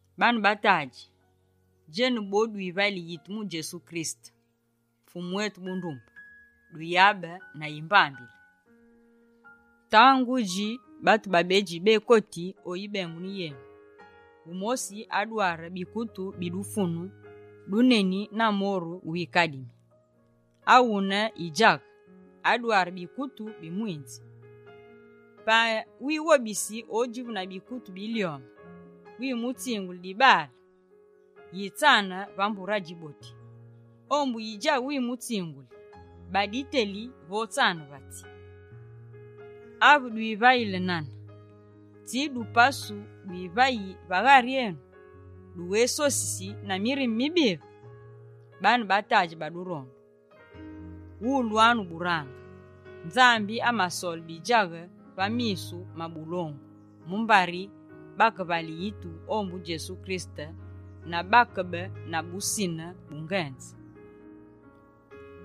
Baane ba tadji, djenu bo dwivayili yitu mu Djesu Kirisete, Fumu etu bundumbe, duyabe na yimbambile. Tangudji, batu babedji bekoti o yibengunu yenu. Wumosi adware bikutu bi dufunu duneni na moru wikadimi. Awune yidjaghe, adware bikutu bi mwinzi. Pa wighobisi odjivu na bikutu bilyome, wimutsinguli dibaale: «Yitsane va mbure adjiboti.» Ombu yidjaghe wimutsinguli: «Ba diteli vo tsane va tsi.» Ave dwivayili nane, tsi dupasu dwivayi va ghari enu? Dughésosisi na mirime mibive? Baane ba tadji ba durondu, wulwanu burange: Nzambi asamasole bidjaghe va misu ma bulongu mumbari bakevayile yitu ombu Djesu Kirisete na bakebe na busine bungenze,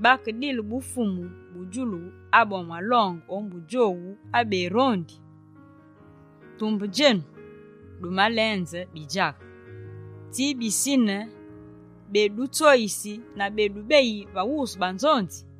bakedile bufumu bu djulu abu amalonge ombu djowu abemurondi? Tumbe djenu, dumalenze bidjaghe! Tsi bisine bedutsoyisi na bedubeyi va wusu banzonzi?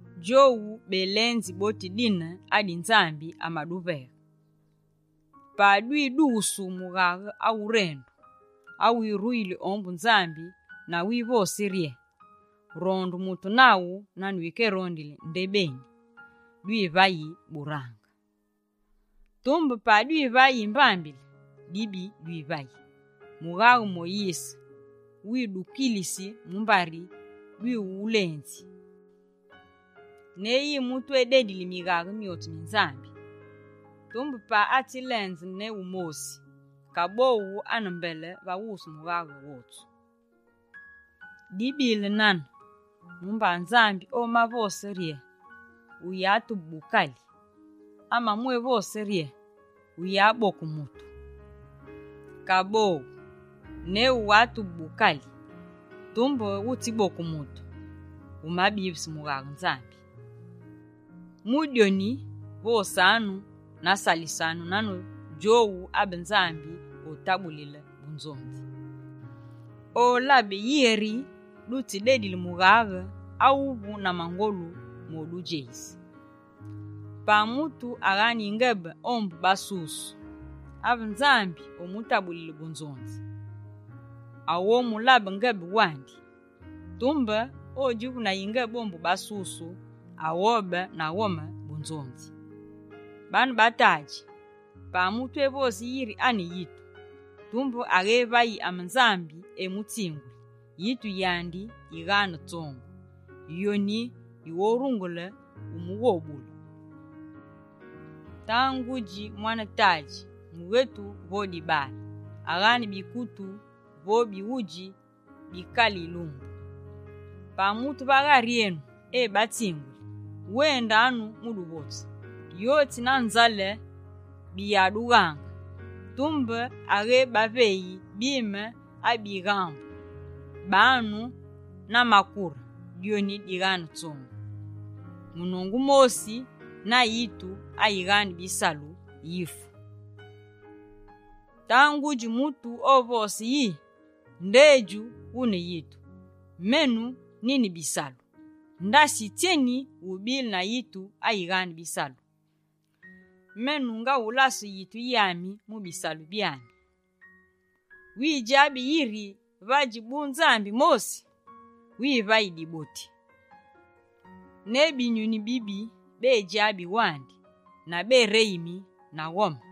Djowu belenzi boti dine adi Nzambi amaduveghe. Pa dwidughusu mughaghe awurendu, awiruyili ombu Nzambi na wivosi rye: «Ronde mutu naghu nane wikerondili ndebeni», dwivayi burange. Tumbe pa dwivayi yimbambile, dibi dwivayi, mughaghe Moyise widukilisi mumbari dwiwulenzi. Ne yi mutu ededili mighaghe myotsu mi Nzambi, tumbe pa atsi lenze ne wumosi, kaboghu ane mbele va wusu mughaghe wotsu. Dibile nane, mumba Nzambi omavose rye: «Wuyatube bukali», amamwévose rye: «Wuyaboke mutu.» Kaboghu, ne wughatube bukali tumbe wutsiboke mutu, wumabise mughaghe Nzambi. Mu dyoni, vosanu na salisanu nane djowu abe Nzambi otabulile bunzonzi. Olabe yeri dutsidedile mughaghe awuvu na mangolu modudjeyise. Pa mutu aghane yingebe ombu basusu, ave Nzambi omutabulile bunzonzi, aghomulabe ngebe wandi. Tumbe odjivu na yingebe ombu basusu, aghobe na ghome bunzonzi. Baane ba tadji, pa mutu evosi yiri ane yitu, tumbe aghévayi ame Nzambi etsinguli, yitu yandi yighane tsongu. Yoni yighorungule umughobule. Tangudji mwane tadji, mughetu vo dibale, aghane bikutu vo bighudji bi kale yilumbu. Pa mutu va ghari enu ebatsinguli: «Wendanu mu duvotsu, yotsi na nzale biyadughaange», tumbe aghébaveyi bime abibaghambu, banu na makure. Dyoni dighane tsongu. Munongu mosi na yitu ayighane bisalu, yifu. Tangudji, mutu ovose yi: «Ndedju wune yitu, menu nine bisalu.» Ndasi tsyeni wubile na yitu ayighane bisalu, menu ngawulase yitu yami mu bisalu byami. Widjabi yiri vadji bu Nzambi mosi? Wivayi diboti. Ne binyuni bibi bedidjabi wandi, na bereyimi na ghome.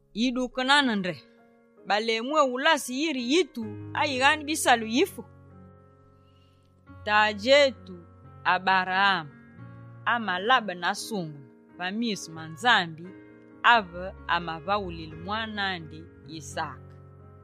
Yiduke nane nde, balemwéwulase yiri yitu ayighane bisalu, yifu? Tadji etu Aberaame amalabene asungeme va misu ma Nzambi ave amavaghulile mwane andi Yisaake.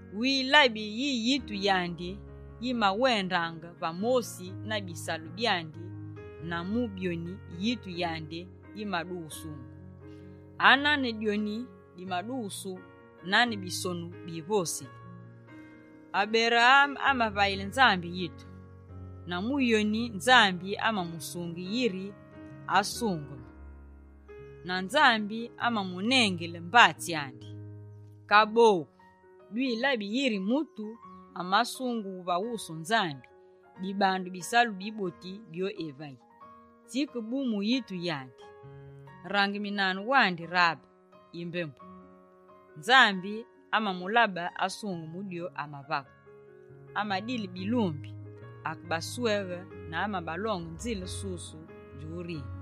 Wilabi yi yitu yandi yimawendaange va mosi na bisalu byandi, na mu byoni yitu yandi yimadughusu. Anane dyoni dimadughusu nane Bisonu bi Nzambi bivosili: «Aberaame amavayile Nzambi yitu, na mu yoni Nzambi amamusinge yiri asungeme.» Na Nzambi amamunengile mbatsi andi. Kaboghu, dwilabi yiri mutu amasungughu va wusu Nzambi, dibandu bisalu biboti byo evayi, tsike bu mu yitu yandi. Rangeminanu wandi Rabe yimbembu. Nzambi amamulabe asungeme mu dyo amavaghe. Amadile bilumbi, akebasweghe na amabalonge nzile susu djurinine.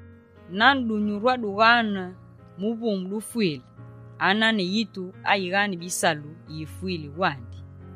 Nane dunyuru adughane muvumu dufwile, anane yitu ayighane bisalu yifwile wandi.